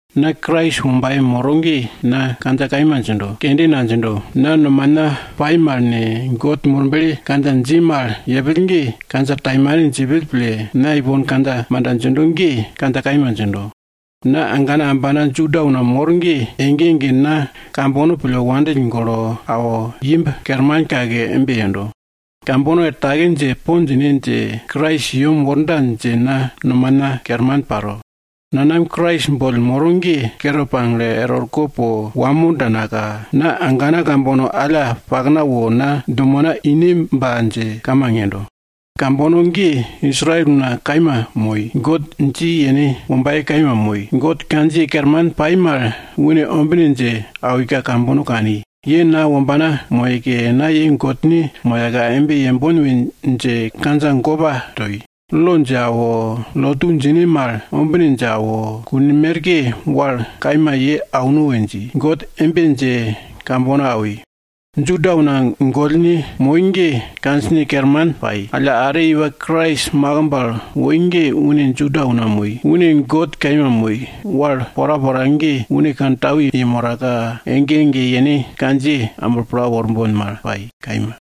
Na Krais wombaye moro ge na kandja kaima djindo, kende nadjindo. Na nomana pai mal ne, God Murble kandja dji mal yepill ge kandja taimane djipill pille, na ipon kandja manda djindo ge kandja kaima djindo. Na agana ambana Juda una mor ge, ege ege na kambono pille wandill golo awo imb kerman kake embe yendo. Kambono er take dje po djine dje, Krais i yem worda dje na nomana kerman paro. Nanam Krais boll moro ge kere pagle er orko po wamo danaka, na agana kambono alla pakna wo na dumena ineba dje kamang yendo. Kambono ge Israel una kaima moi. God dji yene wombaye kaima moi. God kandjiye kerman pai mal une ombine dje awika kambono kani. Ye na wombana moyeke, na ye Godne moyaka, embe yembon we dje kandja gopa toi. Lo dje awo, lotu djine mal ombine dje awo, kun merke wal kaima ye auno we dje, God embe dje kambono awi. Juda una gollne moi ge kandjine kerman pai. Alla are iwa Krais makimb al woi ge une Juda una moi. Une God kaima moi. Wal porapora ge une kantau yemoraka, ege ege yene kandjiye amblo pla worbon mal pai, kaima.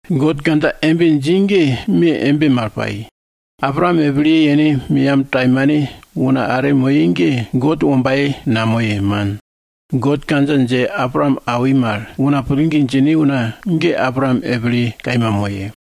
God kandja embe dji ge me embe mal pai. Abraam epilye yene meyam taimane una are moye ge God wombaye namoye, man. God kandja dje Abraam awi mal, una pillgi djine una ge Abraam epilye kaima moye.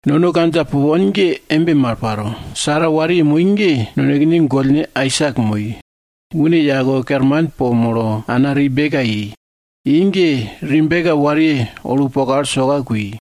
Nono kandja pupon ge embe mal paro. Sara wariye moi ge nonekene gollne Aisak moi. Une yake kerman po molo, ana Rebeka i. I ge Rebeka wariye olupokal soka kui.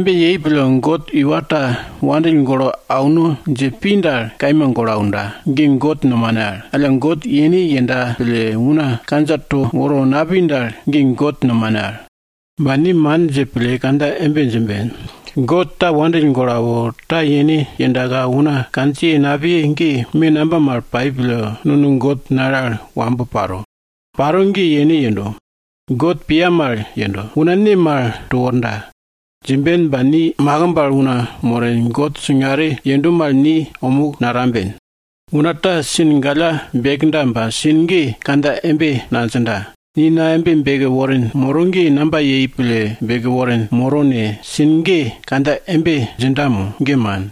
Embe yei pille, God iwa ta wandill golo auno dje pi dal, kaima golo aunda, ge God nomane al. Alla God yene yenda pille una kandja to woro napi dal, ge God nomane. Ba ni man dje pille kandja embe djimben, God ta wandill golo awo, ta yene yendaka una kandja napiye ge, me namba mal pai pille nono God nale al wambo paro? Paro ge yene yendo. God piya mal yenda, una ne mal to worda? Djimben ba ni makimb al una moren, God singare yenda mal ni omuk natamben. Una ta sin galla bekda ba sin ge kandja embe nadjinda, ni na embe beke worin moro ge namba yei pille beke worin moro ne? sin galla ge kandja embe djinda mo? Ge man!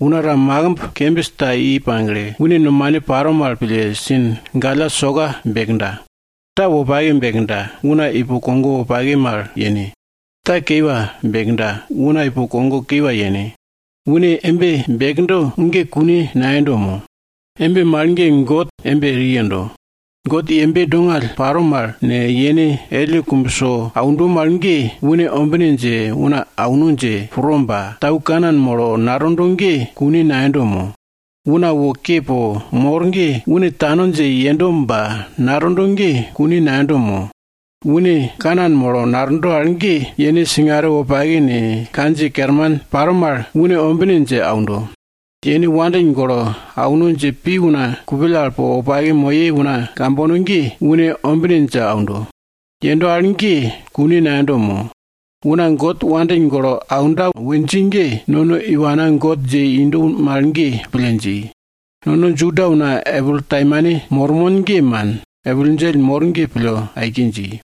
Una ta makimb kembis ta i pagle, une nomane paro mal pille sin galla soka bekda. Ta wopake bekda, una ipo kogo wopake mal yene. Ta kiwa bekda, una ipo kogo kiwa yene. Une embe bekdo ge kune nayendo mo? Embe mal ge God embe eri yendo. God yembe dongall paro mal ne, yene elle kumbso aundo mal ge, une ombine dje una auno dje pro ba tau kanan molo natondo ge kune nayendo mo? Una wo ke po mor ge une tano dje yendo ba natondo ge kune nayendo mo? Une kanan molo natondo al ge, yene singare wopake ne, kandjiye kerman paro mal une ombine dje aundo. Yene wandill golo auno dje pi una kupill al po wopake moye una kambono ge, une ombine dje aundo. Yendo al ge, kune nayendo mo? Una God wandill golo aunda we dji ge, nono iwana God dje indo mal ge, pille dji. Nono Juda una epil taimane mormon ge man, epil djell mor ge pille aike dji.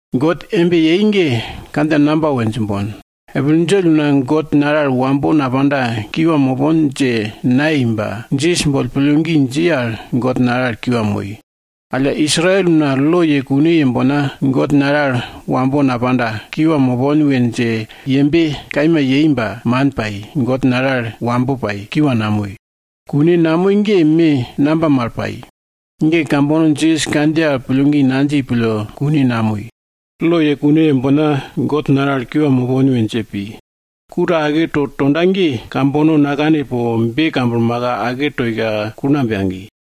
God embe yei ge kandja namba we djimbon? Epil djell una God nale al wambo napanda kiwa mopon dje nayei ba, Jisas boll pillgi dji al, God nale al kiwa moi. Alla Israel una lo ye kune yembonka, God nale al wambo napanda, kiwa mopon we dje yembe kaima yei ba, man pai, God nale al wambo pai, kiwa namoi. Kune namoi ge me namba mal pai? Ge kambono Jisas kandjiye al pillgi nadji pille kune namoi. Lo ye kune yembonka God nale al kiwa mopon we dje pi. Ku ta aketo tonda ge, kambono nakane po be kamblmaka, ake toika kulngamb yagi.